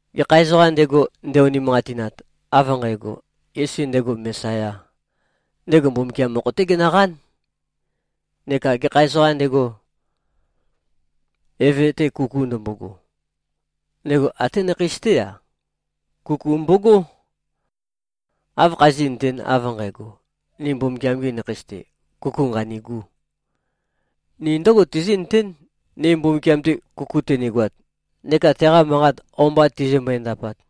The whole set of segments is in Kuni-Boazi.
Gekha ezoqām ndego, nde-unimanqatinat, av nqægo, Yesu ndego Mesayā, ndego Mbumbukiam mokho-té genøqán. Neka gekha ezoqām ndego, eve-te kuku ndømbogo, ndego até nakheis-té-a, kuku mbogó. Áv khazí꞉nøtēn, av nqægo, ni Mbumbukiam-gi nakheis-te, kuku nqanîgū? Ni ndǿgo tizí꞉nøtén, ni Mbumbukiam-te kuku tønigoat neka teqa manqat o-mba tizimbøe-ndapat.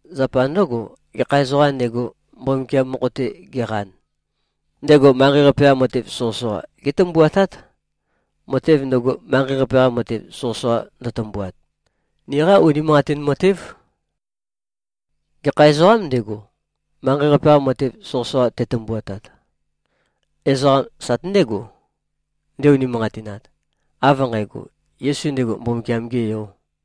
Zapa ndǿgo, gekha ezoqām ndego, Mbumbukiam mokho-te geqan, ndego manqei-qape-qa matev soqøsoqa gétømbuatát. Matev ndøgo, manqei-qape-qa matev soqøsoqa ndøtømbuat, niqá unimanqatin matév. Gekha ezoqâm ndego, manqei-qape-qa matev soqøsoqa tetømbuatat? Ezoqam sate ndégo, nde-unimanqatinat, av nqægo, Yesu ndego Mbumbukiam-gē Yō.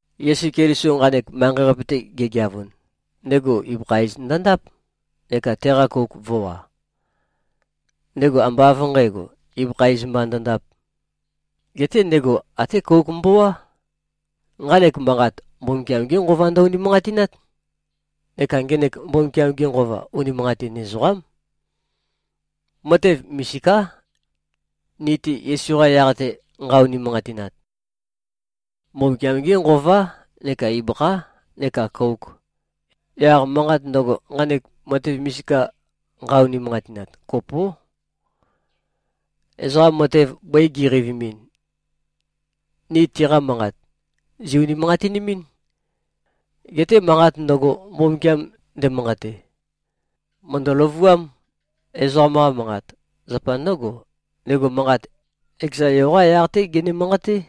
Yesu Keliso nqanek manqei-qape-te gegeavun, ndego ibøkha iz ndøndáp neka teqa kouk vø̄wa. Ndego ambá av nqǣgo, ibøkha iz mba ndøndāp. Geté ndego até kouk mbowá. Nqanek manqat, Mbumbukiam-gé Nqova ndø-unimanqatinát. Neka ngenek Mbumbukiam-ge Nqova, unimanqatin ezoqám. Matev misiká, ni-te Yesu-qa yaq-te, nqa-unimanqatinat. Mbumbukiam-gé Nqová neka ibøkhá neka kōuk. Yaq manqat ndøgo, nqanek matev misika nqa-unimanqatinat, kopó. Ezoqa matev bøi gi꞉qeivimin, ni tiqa manqat, zì-unimanqatinimín. Geté manqat ndøgo, Mbumbukiam ndemanqate, mø̀ndø-løvuám, ezoqam-qa manqat. Zapa ndǿgo, ndego manqat, ekeza Yo-qá yaq-té gene-manqaté.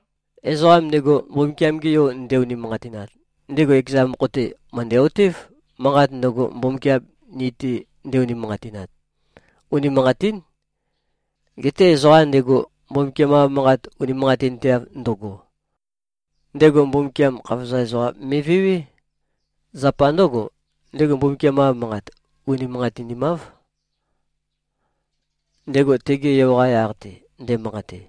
Ezoqam ndego, Mbumbukiam-ge Yo nde-unimanqatinat, ndego ekeza mokho-te, mø̀ndæ-otév, manqat ndøgo, Mbumbukiam ni-te nde-unimanqatinat, unimanqatín. Geté ezoqa ndego, Mbumbukiam-qa Manqat unimanqatinteav ndøgo, ndego Mbumbukiam khavozam ezoqam me꞉vewé. Zapa ndǿgo, ndego Mbumbukiam-qa Manqat unimanqatinimáv, ndego tege Yo-qa yaq-te nde꞉manqate.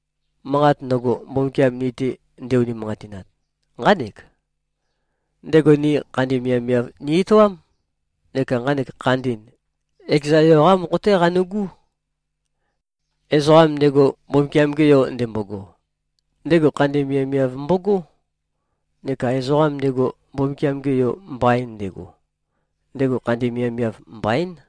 Manqat ndøgo, Mbumbukiam ni-te nde-unimanqatinat, nqánek: Ndego ni khandi miavmiav ni-etoám. Neka nqanek khandi, ekeza Yo-qá mokho-té qanu꞉gú. Ezoqam ndego, Mbumbukiam-ge Yo ndembogo, ndego khandi miavmiav mbogó. Neka ezoqam ndego, Mbumbukiam-ge Yo mbain ndego, ndego khandi miavmiav, mbaín.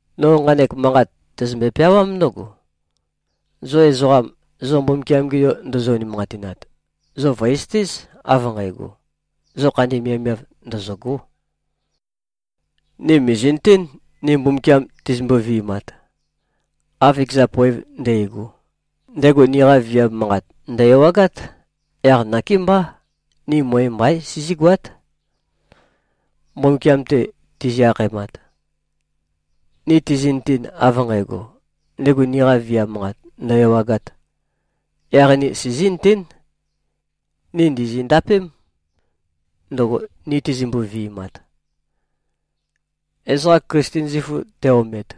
No nqanek manqat tæzømbe-peawám ndǿgo: Zo ezoqam, zo Mbumbukiam-ge Yo ndozo-unimanqatinat, zo vø̀ezøtéz, av nqægo, zo khandi miavmiav, ndøzø̂gó. Ni mìzi꞉nøtén, ni Mbumbukiam tizimbo-vi꞉mat, av ekeza poev ndægo, ndego niqa viam manqat, ndø̀-ewagát. Yaq nakémbá, ni møe mbaín, sizígoát, Mbumbukiam-te tizi-akhaemat. Ni tizi꞉nøten, av nqægo, ndego niqa viam manqat ndø̀-ewagāt, yaq ni sizí꞉nøtén, ni ndìzi-ndapém ndøgo, ni tizimbøe-vi꞉mat. Ezoqa Klisten zifu te-omet,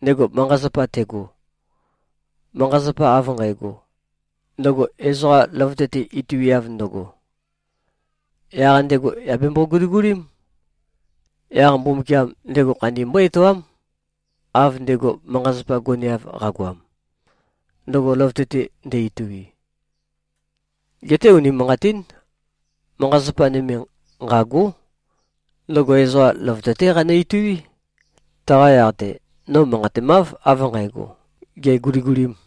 ndego manqa-zapa tego, manqa-zapa av nqægo, ndøgo ezoqa løvøte-te ituiav ndøgo, yaq ndego yà bembo-guligulím. Yaq Mbumbukiam ndego khandi mbó-etoám, av ndego manqa-zapa goneav qagoam, ndøgo løvøte-te ndø-itui. Geté unimanqatín. Manqa-zapa nøme, nqâgó. Ndøgo ezoqa løvøte-té qanø-ituí. Taqa yaq-te, no manqatemáv, av nqǣgo, gè꞉guligulīm.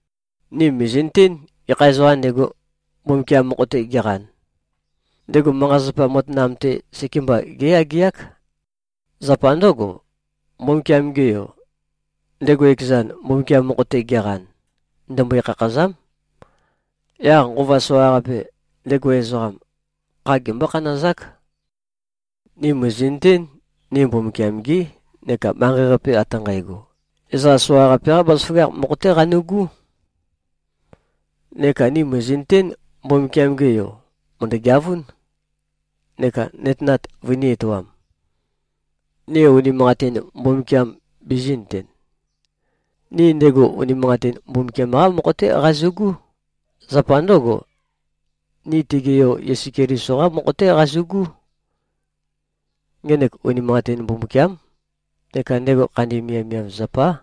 Ni mìzi꞉nøtén, gekha ezoqām ndego, Mbumbukiam mokho-te geqan, ndego manqa-zapa matanam-te sekemba géyageák. Zapa ndǿgo, Mbumbukiam-ge Yo, ndego ekezan, Mbumbukiam mokho-te geqan, ndembøe-khakhâzám. Yaq nqova soqaqape, ndego ezoqam, kha gembó-khanazák. Ni mìzi꞉nøtén, ni Mbumbukiam-gí, neka manqei-qape ate nqægo, ezoqa soqaqape-qá bazaføgakh mokho-té qanu꞉gú. Neka ni mìzi꞉nøtén, Mbumbukiam-ge Yo mø̀ndø-geavún, neka nøtenat vønī-etoam, ni unimanqatin Mbumbukiam bizī꞉nøten. Ni ndego unimanqatin Mbumbukiam-qá mokho-té qazu꞉gú. Zapa ndǿgo, ni tege Yo Yesu Keliso-qá mokho-té qazu꞉gú. Ngenek unimanqatin Mbumbukiám, neka ndego khandi miavmiav zapá.